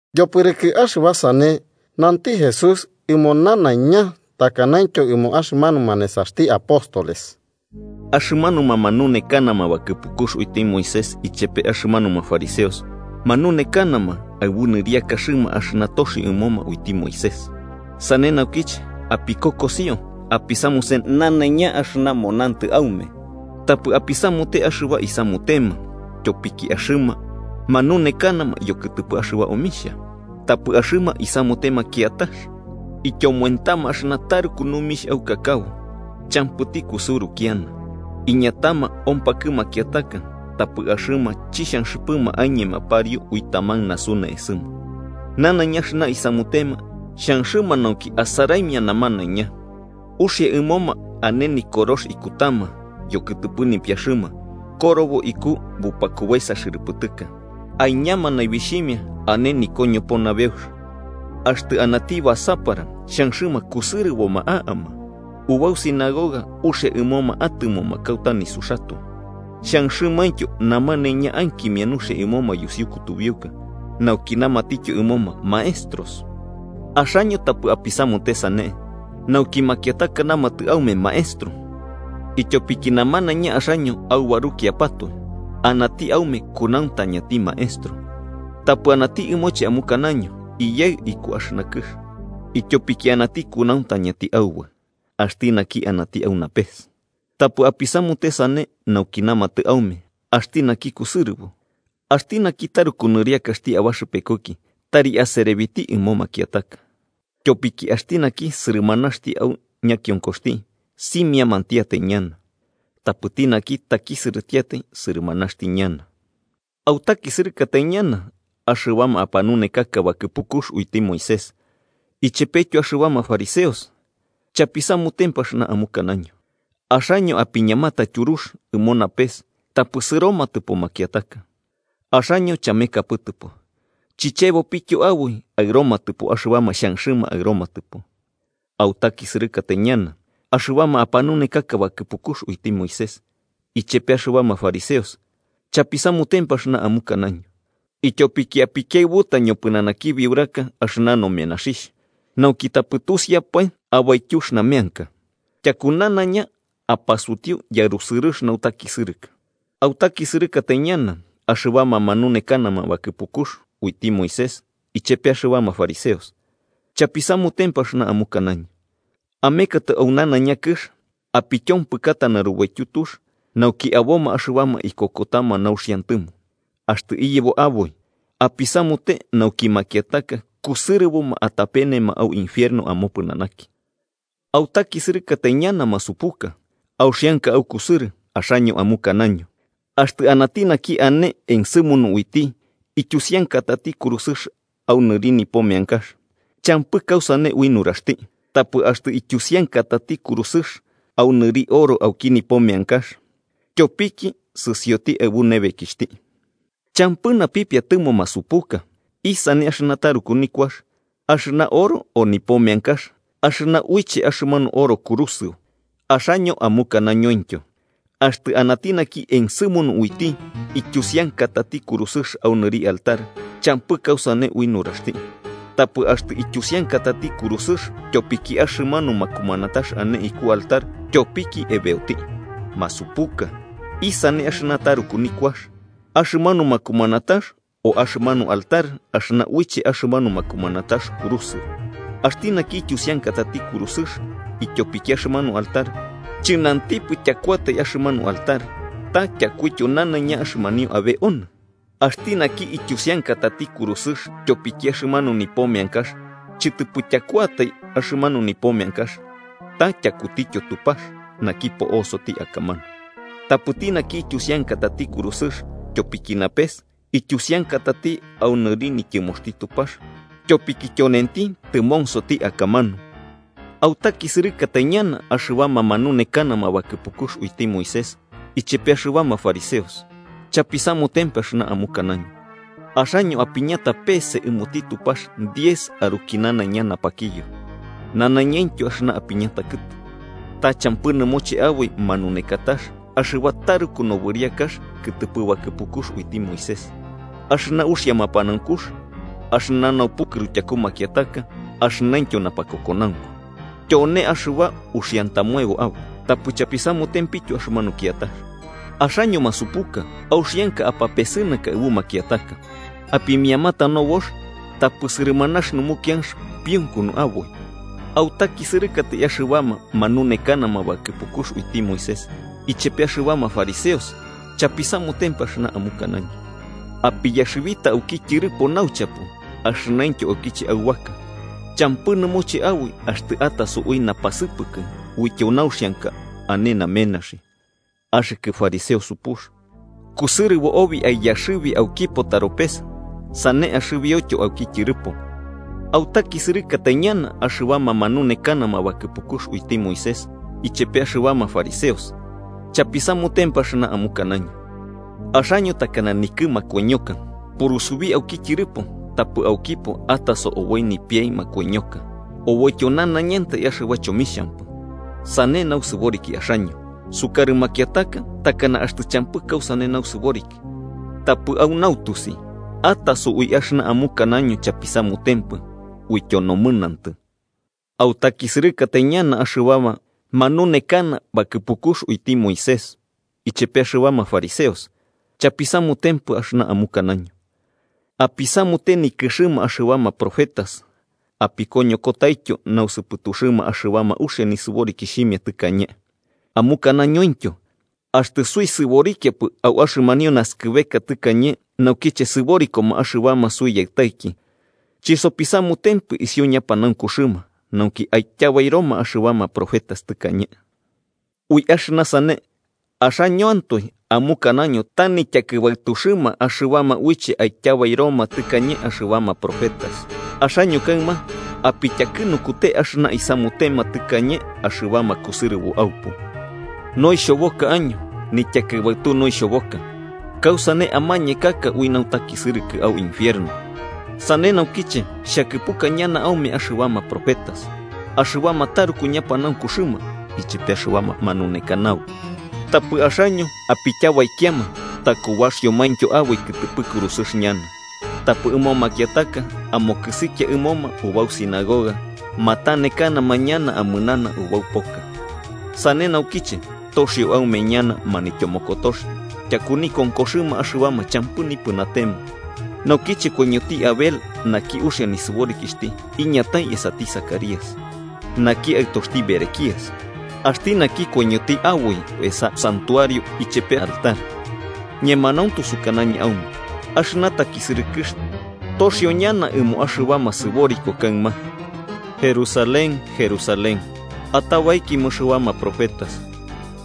Yopɨrɨkɨ axɨba sane, nanti Jesús ɨmo nanaiña takanaintyo ɨmo axɨmanuma nesaxti apóstoles: “Axɨmanuma manunekanama bakɨpukux uiti Moisés ichepe axɨmanuma fariseos manunekanama aɨbu nɨriakaxɨma axɨna toxio ɨmoma uiti Moisés. Sane naukiche, apikokosio apisamuse nanaiña axɨna monantɨ aume. Tapɨ apisamute axɨba isamutema, tyopiki axɨma manuanekanama yokɨtɨpɨ axɨba omixhia tapɨ axɨma isamutema kiatax. Ityomoentama axɨna taruku numix aukakabo champɨti kusɨuru kiana, iñatama ompakɨ makiataka, tapɨ axɨma chixhanxɨpɨma aiñema pariu ui taman nasu ne'esɨma. Nanaiña axɨna isamutema xhanxɨma nauki asaraimia namanaiña. Uxia ɨmoma ane Nikorox ikutama yokɨtɨpɨ nipiaxɨma korobo iku bupakubaesa xɨrɨpɨtɨka, aiñama naibixhimia ñana ane nikoñopo nabeux. Axtɨ anati basapara xhanxɨma kusɨrɨboma a'ama ubau sinagogas uxia ɨmoma atɨmoma kauta nisuxatoe, xhanxɨmaintyo namanaiña ankimia nuxia ɨmoma yusiu kutubiuka nauki namatityo ɨmoma maestros. “Axaño tapɨ apisamute sane nauki makiataka namatɨ aume maestro, ityopiki namanaiña axaño aubarukiapatoe anati aume kunauntañati Maestro. Tapɨ anati ɨmoche amukanaño iyaɨ iku axɨna kɨx, ityopiki anati kunauntañati Aubaɨ: axti naki anati au napes. Tapɨ apisamute sane nauki namatɨ aume axti naki kusɨrɨbo. Axti naki taruku nɨriakaxti abaxɨpekuki tari aserebiti ɨmo makiataka. Tyopiki axti naki sɨrɨmanaxti au ñakionkoxti, simiamantiatai ñana. Tapɨti naki takisɨrɨtiatai, sɨrɨmanaxti ñana. “¡Autakisɨrɨkatai ñana, axɨbama apanunekaka bakɨpukux uiti Moisés ichepetyo axɨbama fariseos, chapisamutempɨ axɨna amukanaño!, axaño apiñamata tyurux ɨmo napes tapɨ sɨromatɨpo makiataka. Axaño chamekapɨtɨpo, chichebopityo aboi aɨromatɨpo axɨbama xhanxɨma aɨromatɨpo. “¡Autakisɨrɨkatai ñana, axɨbama apanunekaka bakɨpukux uiti Moisés ichepe axɨbama fariseos, chapisamutempɨ axɨna amukanaño!, ityopiki apikiaɨbuta ñopɨnanaki biuraka axɨna nomenaxhixh, nauki tapɨ tusiapae abaityux nameanka. Tyaku ñana apasutiu yarusɨrɨx nautakisɨrɨkɨ. “¡Autakisɨrɨkatai ñana, axɨbama manunekaka bakɨpukux uiti Moisés ichepe axɨbama fariseos, chapisamutempɨ axɨna amukanaño!, amekatɨ au nanaiña kɨx apityompɨkata narubaityu tux, nauki aboma axɨbama ikokotama nauxiantɨmo, axtɨ iyebo aboi, apisamute nauki makiataka kusɨrɨboma atapenema au infierno amopɨnanaki. “¡Autakisɨrɨkatai ñana, masupusu auxianka aukusɨrɨ!, axaño amukanaño: ‘Axtɨ anati naki ane ensɨmunu uiti ityusiankatati kurusɨx au nɨri nipo meankax, champɨ kausane ui nuraxti. Tapɨ axtɨ ityusiankatati kurusɨx au nɨri oro auki nipo meankax, tyopiki sɨsioti aɨbu nebekixhti.’ ¡Champɨ napipiatɨmo masupuka! ¿Isane axɨna taruku nikuax: axɨna oro o nipo meankax axɨna uiche axɨmanu oro kurusɨo? Axaño amukanañointyo: ‘Axtɨ anati naki ensɨmunu uiti ityusiankatati kurusɨx au nɨri altar, champɨ kausane ui nuraxti. Tapɨ axtɨ ityusiankatati kurusɨx tyopiki axɨmanu makumanatax ane iku altar, tyopiki ebeoti.’ ¡Masupuka! ¿Isane axɨna taruku nikuax: axɨmanu makumanatax o axɨmanu altar axɨna uiche axɨmanu makumanatax kurusɨo? Axti naki ityusiankatati kurusɨx ityopiki axɨmanu altar, chɨnantipɨ tyakuatai axɨmanu altar, ta tyakuityo nanaiña axɨmanio abe onɨ. Axti naki ityusiankatati kurusɨx tyopiki axɨmanu nipo meankax, chɨtɨpɨ tyakuatai axɨmanu nipo meankax, ta tyakutityo Tupax, naki po'osoti akamanu. Tapɨti naki ityusiankatati kurusɨx tyopiki napes, ityusiankatati au nɨri nityɨmoxti Tupax tyopiki tyonenti tɨmonsoti akamanu. “¡Autakisɨrɨkatai ñana axɨbama manunekanama bakɨpukux uiti Moisés ichepe axɨbama fariseos, chapisamutempɨ axɨna amukanaño!, axaño apiñata peese ɨmoti Tupax diez aruki nanaiña napakiyo, nanaiñaintyo axɨna apiñata kɨtu, ta champɨ nɨmoche aboi manunekatax axɨba taruku nobɨriakax kɨtɨpɨ bakɨpukux uiti Moisés, axɨna uxia mapanaunkux, axɨna naupukɨru tyaku makiataka axɨnaintyo napakokonaunku. Tyone axɨba uxiantamoebo aboi, tapɨ chapisamutempityo axɨmanu kiatax. ¡Axaño masupuka, auxianka apapesɨnaka aɨbu makiataka, apimiamata nobox, tapɨ sɨrɨmanax numukianx piunkunu aboi! “¡Autakisɨrɨkatai axɨbama manunekana bakɨpukux uiti Moisés ichepe axɨbama fariseos, chapisamutempɨ axɨna amukanaño!, apiyaxɨbita auki tyɨrɨpo nauchapo axɨnaintyo aukiche aubaka, champɨ nɨmoche aboi axtɨ ataso ui napasɨpɨkɨ uityo nauxianka ane namenaxi. ¡Axɨkɨ fariseo supux: kusɨrɨbo obi aiyaxɨbi aukipo taropes, sane axɨbioityo auki tyɨrɨpo! “¡Autakisɨrɨkatai naña axɨbama manunekana bakɨpukux uiti Moisés ichepe axɨbama fariseos, chapisamutempɨ axɨna amukanaño!, axaño takana nikɨ makoiñoka purusubi auki tyɨrɨpo, tapɨ aukipo ataso oboi nipiai makoiñoka oboityo nanaiñantai axɨba chomixhampɨ. Sane nausɨboriki axaño: sukarɨ makiataka takana axtɨ champɨ kausane nausɨboriki, tapɨ au nautusi ataso ui axɨna amukanaño chapisamutempɨ uityo nomɨnantɨ. “¡Autakisɨrɨkatai ñana axɨbama manunekana bakɨpukux uiti Moisés ichepe axɨbama fariseos, chapisamutempɨ axɨna amukanaño! apisamute nikɨxɨma axɨbama profetas apikoñokotaityo nausɨpɨtuxɨma axɨbama uxia nisɨborikixhimia tɨkañe, amukanañointyo: ‘Axtɨ suisɨborikiapɨ au axɨmanio naskɨbeka tɨkañe naukiche sɨborikoma axɨbama suiyaɨtaiki, chisopisamutempɨ isiu ñapanaunkuxɨma nauki aityabairoma axɨbama profetas tɨkañe.’ Ui axɨna sane, axañoantoe amukanaño ta nityakɨbaɨtuxɨma axɨbama uiche aityabairoma tɨkañe axɨbama profetas. ¡Axaño kaɨma apityakɨnukute axɨna isamutema tɨkañe axɨbama kusɨrɨbo aupu! “¡Noixhoboka año! ¡Nityakɨbaɨtu noixhoboka! ¿Kausane amañekaka ui nautakisɨrɨkɨ au infierno? Sane naukiche xhakɨpuka ñana aume axɨbama profetas, axɨbama taruku ñapanaunkuxɨma ichepe axɨbama manunekanabo. Tapɨ axaño apityabaikiama takubaxiomaintyo aboi kɨtɨpɨ kurusɨx ñana, tapɨ ɨmo makiataka amokɨsikia ɨmoma ubau sinagoga matanekanama ñana amɨnana ubau poka. Sane naukiche toxio aume ñana manityomokotox tyaku nikonkoxɨma axɨbama champɨ nipɨnatema naukiche koiñoti Abel naki uxia nisɨborikixhti iñatai esati Zacarías, naki aɨtoxti Berequías, axti naki koiñoti aboi esa santuario ichepe altar. Ñemanauntu sukanañɨ aume axɨna takisɨrɨkɨx toxio ñana ɨmo axɨbama sɨboriko kaɨma. “¡Jerusalén, Jerusalén, atabaikia ɨmo axɨbama profetas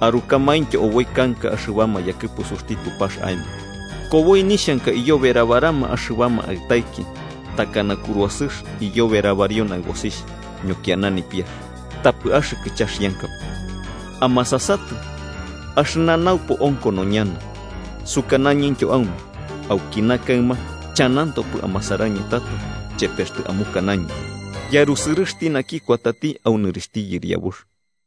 arukamaintyo oboi kanka axɨbama yakɨpusuxti Tupax aemo! ¡Koboi nixhanka iyoberabarama axɨbama aɨtaiki, takana kuruasɨx iyoberabario naɨbosixh ñokiana nipiax, tapɨ axɨkɨ chaxiankapɨ! Amasasatɨ, axɨna naupo onkono ñana. Sukanañɨntyo aume, aukina kaɨma, chanantopɨ amasarañɨ tato chepe axtɨ amukanaño: ‘¡Yarusɨrɨxti naki kuatati au nɨrixhti Yɨriabux!’”